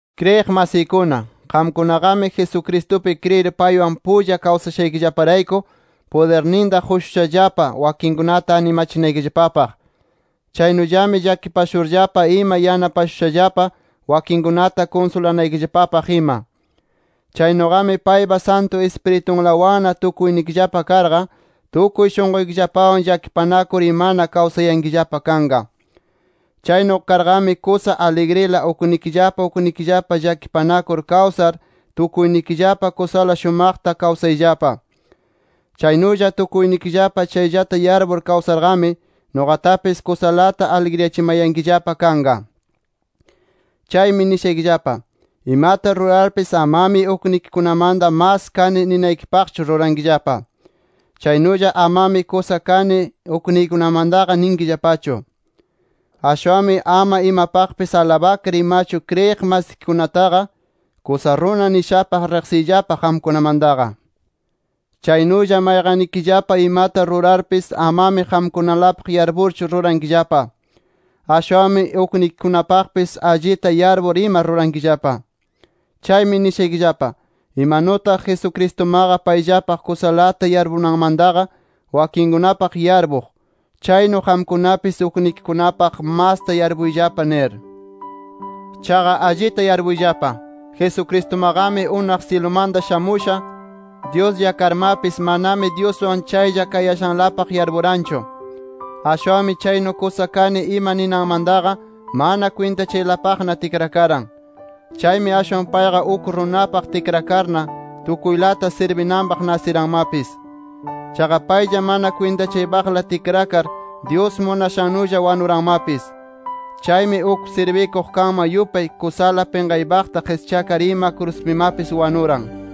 Kriyiq masiykuna, qamkunaqami Jesucristupi kriyir paywan pulla kawsashaykillaparayku, pudirninta qushushallapa wakinkunata animachinaykillapapaq. Chaynullami llakipashurllapa ima yanapashushallapa wakinkunata kunsulanaykillapapaq ima. Chaynuqami paypa Santu Ispiritunlawanna tukuynikillapa karqa, tukuy shunquykillapawan llakipanakur imana kawsayankillapa kanqa. Chaynu karqami, kusa aligrila uknikillapa uknikillapa llakipanakur kawsar tukuynikillapa kusala shumaqta kawsayllapa. Chaynulla, tukuynikillapa chayllata yarpur kawsarqami nuqatapis kusalata aligriyachimayankillapa kanqa. Chaymi nishaykillapa: Imata rurarpis amami uknikikunamanta mas kani ninaykipaqchu rurankillapa. Chaynulla, amami kusana kani ukniykunamantaqa ninkillapachu. Ashwanmi ama imapaqpis alabakar imachu, kriyiq masikikunataqa kusa runa nishapaq riqsiyllapa qamkunamantaqa. Chaynulla mayqannikillapa imata rurarpis amami qamkunalapaq yarpurchu rurankillapa. Ashwanmi uknikikunapaqpis allita yarpur ima rurankillapa. Chaymi nishaykillapa: Imanutaq Jesucristumaqa payllapaq kusalata yarpunanmantaqa wakinkunapaq yarpuq, chaynu qamkunapis uknikikunapaq masta yarpuyllapa nir. Chaqa allita yarpuyllapa: Jesucristumaqami unaq syilumanta shamusha Dyuslla karmapis, manami Dyuswan chaylla kayashanlapaqqa yarpuranchu. Ashwanmi chaynu kusa kani ima ninanmantaqa, mana kwintachaypaqlana tikrakaran. Chaymi ashwan payqa uk runapaq tikrakarna, tukuylata sirbinanpaq nasiranmapis. Chaqa paylla mana kwintachaypaqla tikrakar, Dyus munashannulla wanuranmapis. Chaymi uk sirbikuq kanman yupay kusala pinqaypaqta qischakar ima kruspimapis wanuran.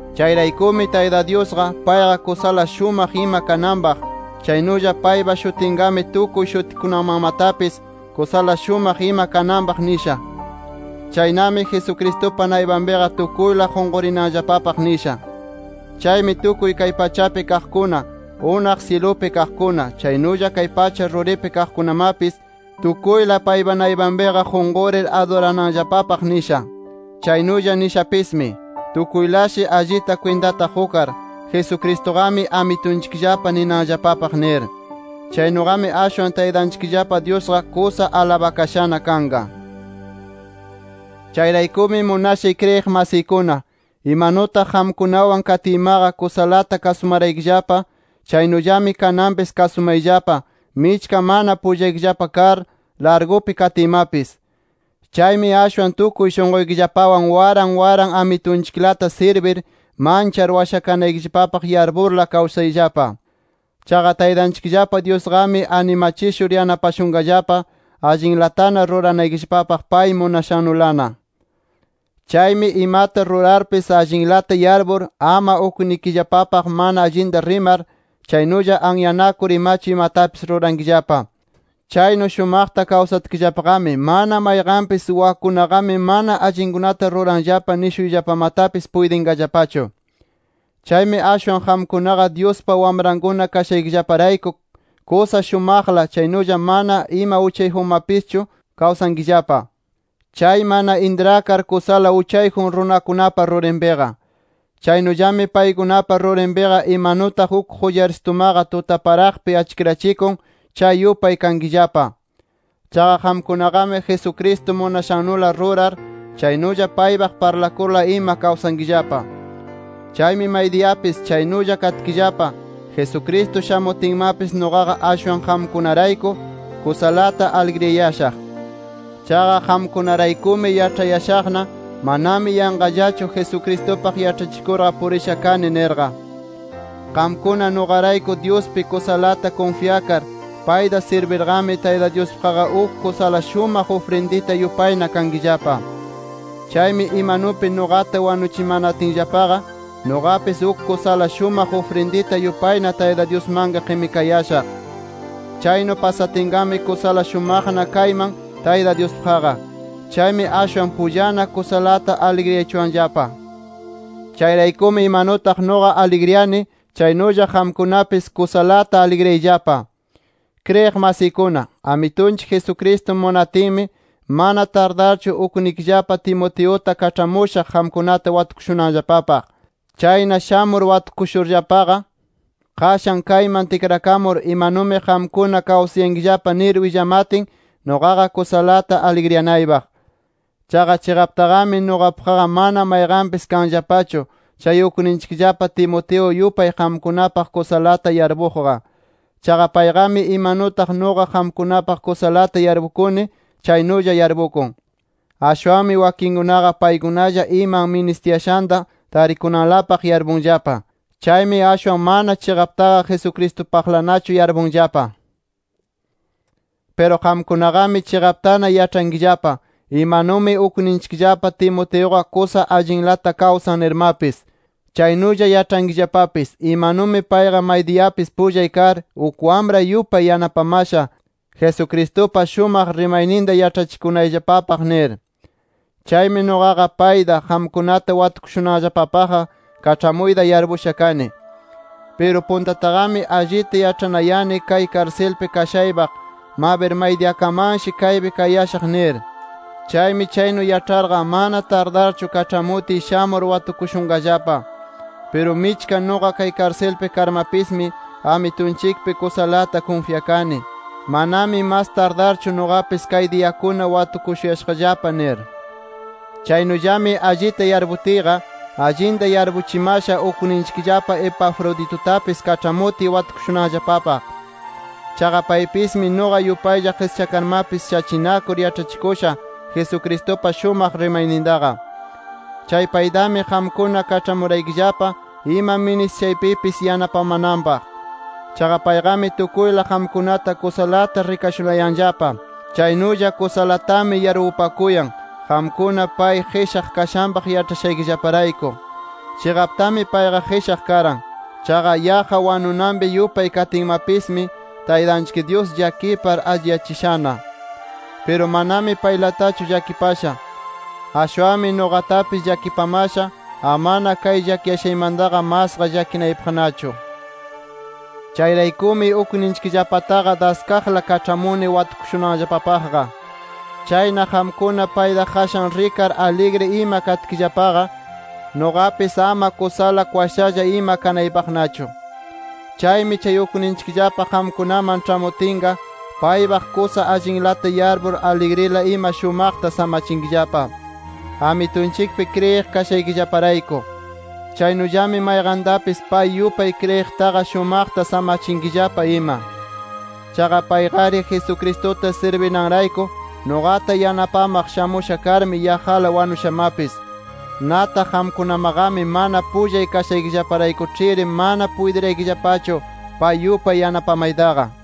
Chayraykumi Tayta Dyusqa, payqa kusala shumaq ima kananpaq, chaynulla paypa shutinqami tukuy shutikunamanmatapis kusala shumaq ima kananpaq nisha. Chaynami Jesucristupa naypanpiqa tukuyla qunqurinanllapapaq nisha. Chaymi tukuy kay pachapi kaqkuna, unaq syilupi kaqkuna, chaynulla pacha ruripi kaqkunamapis, tukuyla paypa naypanpiqa qunqurir adurananllapapaq nisha. Chaynulla nishapismi: Tukuylashi allita kwintata qukar, Jesucristuqami Amitunchikllapa ninanllapapaq nir. Chaynuqami ashwan Taytanchikllapa Dyusqa kusa alabakashana kanqa. Chayraykumi munashay kriyiq masiykuna, imanutaq qamkunawan katiymaqa kusalata kasumaraykillapa, chaynullami kananpis kasumayllapa michka mana pullaykillapa kar, largupi katiymapis. Chaymi ashwan tukuy shunquykillapawan waran waran Amitunchiklata sirbir, manchar washakanaykillapapaq yarpurla kawsayllapa. Chaqa Taytanchikllapa Dyusqami animachishur yanapashunqallapa allinlatana ruranaykillapapaq, pay munashannulana. Chaymi imata rurarpis allinlata yarpur, ama uknikillapapaq mana allinta rimar, chaynulla anyanakur imachu imatapis rurankillapa. Chaynu shumaqta kawsatkillapaqami, mana mayqanpis wakkunaqami mana allinkunata ruranllapa nishuyllapamatapis puytinqallapachu. Chaymi ashwan qamkunaqa, Dyuspa wamrankuna kashaykillaparayku, kusa shumaqlata chaynulla mana ima uchayjunmapischu kawsankillapa, chay mana intrakar, kusala uchayjun runakunapa rurinpiqa. Chaynullami paykunapa rurinpiqa imanutaq uk qullarsitumaqa tutaparaqpi achkirachikun, chay yupay kankillapa. Chaqa qamkunaqami Jesucristo munashannula rurar, chaynulla paypaq parlakurla ima kawsankillapa. Chaymi maydiyapis chaynulla katkillapa, Jesucristo shamutinmapis, nuqaqa ashwan qamkunarayku, kusalata aligriyayashaq. Chaqa qamkunaraykumi, yaĉhayashaqna, manami yanqallachu Jesucristupaq yaĉhachikurqa purisha kani nirqa. Qamkuna nuqarayku Dyuspi kusalata kunfyakar payta sirbirqami, Tayta Dyuspaqqa uk kusa shumaq ufrindita yupayna kankillapa. Chaymi imanupi nuqata wanuchimatinllapaqa, nuqapis uk kusala shumaq ufrindita yupayna Tayta Dyusmanqa qimikayashaq. Chaynu pasatinqami kusala shumaqna kayman Tayta Dyuspaqqa. Chaymi ashwan pullana kusalata aligriyachuwanllapa. Chayraykumi imanutaq nuqa aligriyani, chaynulla qamkunapis kusalata aligriyayllapa. Kriyiq masiykuna, Amitunchik Jesucristo munatinmi mana tardarchu ukninchikllapa Timoteuta kaĉhamushaq qamkunata watukushunanllapapaq. Chayna shamur watukushurllapa, qashan kayman tikrakamur imanumi qamkuna kawsayankillapa nir willamatin nuqaqa kusalata aligriyanaypaq. Chaqa chiqaptaqami, nuqapaqqa mana mayqanpis kanllapachu, chay ukninchikllapa Timoteo yupay qamkunapaq kusalata yarpuqqa. Chaqa payqami imanutaq nuqa qamkunapaq kusalata yarpukuni, chaynulla yarpukun. Ashwanmi wakinkunaqa paykunalla iman ministiyashanta tarikunanlapaq yarpunllapa. Chaymi ashwan mana chiqaptaqa Jesucristupaqlanachu yarpunllapa. Piru qamkunaqami chiqaptana yaĉhankillapa, imanumi ukninchikllapa Timoteuqa kusa allinlata kawsan nirmapis. Chaynulla yaĉhankillapapis, imanumi payqa maydiyapis pullay kar, uk wamray yupay yanapamasha Jesucristupa shumaq rimayninta yaĉhachikunayllapapaq nir. Chaymi nuqaqa payta, qamkunata watukushunanllapapaqqa kaĉhamuyta yarpusha kani. Piru puntataqami allita yaĉhanayani kay karsilpi kayashaypaq, mabir maydiyakamanshi kaypi kayashaq nir. Chaymi chaynu yaĉharqa, mana tardarchu kaĉhamutiy shamur watukushunqallapa. Piru michka nuqa kay karsilpi karmapismi, Amitunchikpi kusalata kunfyakani, manami mas tardarchu nuqapis kay diyakuna watukushuyashaqllapa nir. Chaynullami allita yarputiyqa, allinta yarpuchimasha ukninchikllapa Epafroditutapis kaĉhamutiy watukushunanllapapaq. Chaqa paypismi, nuqa yupaylla qischakarmapis shachinakur yaĉhachikusha Jesucristupa shumaq rimaynintaqa. Chay paytami qamkuna kaĉhamuraykillapa ima ministishaypipis yanapamananpaq. Chaqa payqami tukuyla qamkunata kusalata rikashunayanllapa. Chaynulla kusalatami yarpupakuyan, qamkuna pay qishaq kashanpaq yaĉhashaykillaparayku. Chiqaptami payqa qishaq karan. Chaqa yaqqa wanunanpi yupay katinmapismi, Taytanchik Dyus llakipar alliyachishana. Piru manami paylatachu llakipasha. Ashwanmi nuqatapis llakipamasha, amana kay llakiyashaymantaqa masqa llakinaypaqnachu. Chayraykumi ukninchikllapataqa daskaqla kaĉhamuni watukushunanllapapaqqa. Chayna qamkuna payta qashan rikar aligri ima katkillapaqa, nuqapis ama kusala kwashalla ima kanaypaqnachu. Chaymi chay ukninchikllapa qamkunaman ĉhamutinqa, paypaq kusa allinlata yarpur aligrila ima shumaqta samachinkillapa, Amitunchikpi kriyiq kashaykillaparayku. Chaynullami mayqantapis pay yupay kriyiqtaqa shumaqta samachinkillapa ima. Chaqa payqari Jesucristuta sirbinanrayku, nuqata yanapamaq shamusha karmi yaqqala wanushamapis. Nataq qamkunamaqami mana pullay kashaykillaparaykuĉhiri mana puytiraykillapachu, pay yupay yanapamaytaqa.